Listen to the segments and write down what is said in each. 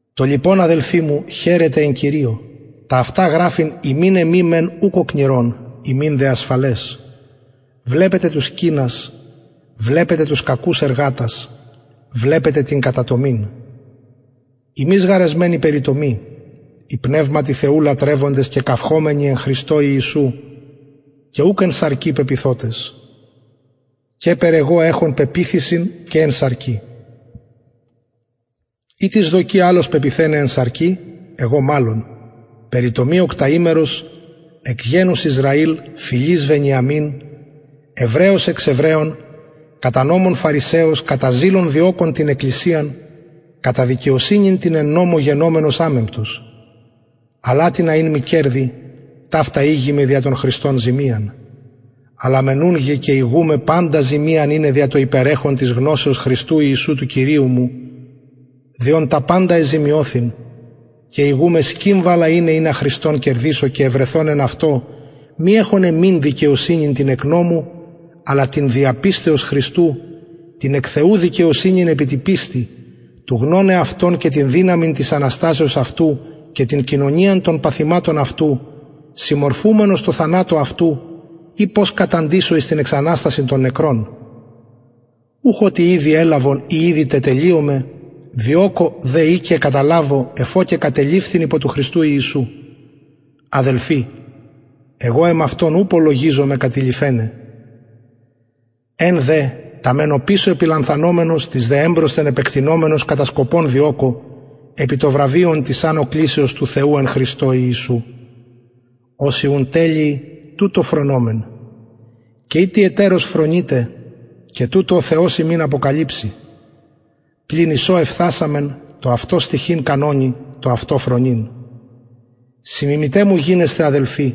το λοιπον αδελφοι μου χαιρετε εν κυριω τα αυτα γραφειν υμιν εμοι μεν ουκ οκνηρον υμιν δε ασφαλες βλεπετε τους κυνας βλεπετε τους κακους εργατας βλεπετε την κατατομην ημεις γαρ εσμεν η περιτομη οι πνευματι θεου λατρευοντες και καυχωμενοι εν χριστω ιησου και ουκ εν σαρκι πεποιθοτες καιπερ εγω εχων πεποιθησιν και εν σαρκι ει τις δοκει αλλος πεποιθεναι εν σαρκι εγω μαλλον περιτομη οκταημερος εκ γενους ισραηλ φυλης βενιαμιν εβραιος εξ εβραιων κατα νομον φαρισαιος κατα ζηλον διωκων την εκκλησιαν κατα δικαιοσυνην την εν νομω γενομενος αμεμπτος αλλ ατινα ην μοι κερδη ταυτα ηγημαι δια τον χριστον ζημιαν αλλα μεν ουν και ηγουμαι παντα ζημιαν ειναι δια το υπερεχον της γνωσεως χριστου ιησου του κυριου μου δι ον τα παντα εζημιωθην και ηγουμαι σκυβαλα ειναι ινα χριστον κερδησω και ευρεθω εν αυτω μη εχων εμην δικαιοσυνην την εκ νομου αλλα την δια πιστεως χριστου την εκ θεου δικαιοσυνην επι τη πιστει του γνωναι αυτον και την δυναμιν της αναστασεως αυτου και την κοινωνιαν των παθηματων αυτου συμμορφουμενος τω θανατω αυτου ει πως καταντησω εις την εξαναστασιν των νεκρων ουχ οτι ηδη ελαβον η ηδη τετελειωμαι διωκω δε ει και καταλαβω εφ ω και κατεληφθην υπο του χριστου ιησου αδελφοι εγω εμαυτον ου λογιζομαι κατειληφεναι εν δε τα μεν οπισω επιλανθανομενος τοις δε εμπροσθεν επεκτεινομενος κατα σκοπον διωκω επι το βραβειον της ανω κλησεως του θεου εν χριστω ιησου οσοι ουν τελειοι τουτο φρονωμεν και ει τι ετερως φρονειτε και τουτο ο θεος υμιν αποκαλυψει πλην εις ο εφθασαμεν τω αυτω στοιχειν κανονι το αυτο φρονειν συμμιμηται μου γινεσθε αδελφοι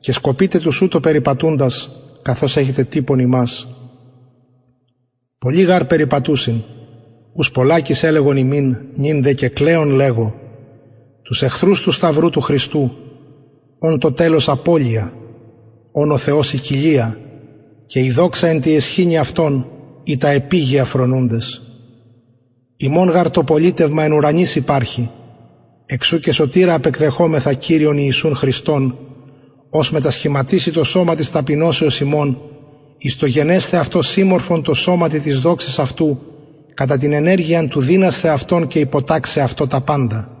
και σκοπειτε τους ουτως περιπατουντας καθως εχετε τυπον ημας πολλοι γαρ περιπατουσιν ους πολλακις ελεγον υμιν νυν δε και κλαιων λεγω τους εχθρους του σταυρου του χριστου ων το τελος απωλεια ων ο θεος η κοιλια και η δοξα εν τη αισχυνη αυτων οι τα επιγεια φρονουντες ημων γαρ το πολιτευμα εν ουρανοις υπαρχει εξ ου και σωτηρα απεκδεχομεθα κυριον ιησουν χριστον ος μετασχηματισει το σωμα της ταπεινωσεως ημων εις το γενεσθαι αυτο συμμορφον τω σωματι της δοξης αυτου κατα την ενεργειαν του δυνασθαι αυτον και υποταξαι εαυτω τα παντα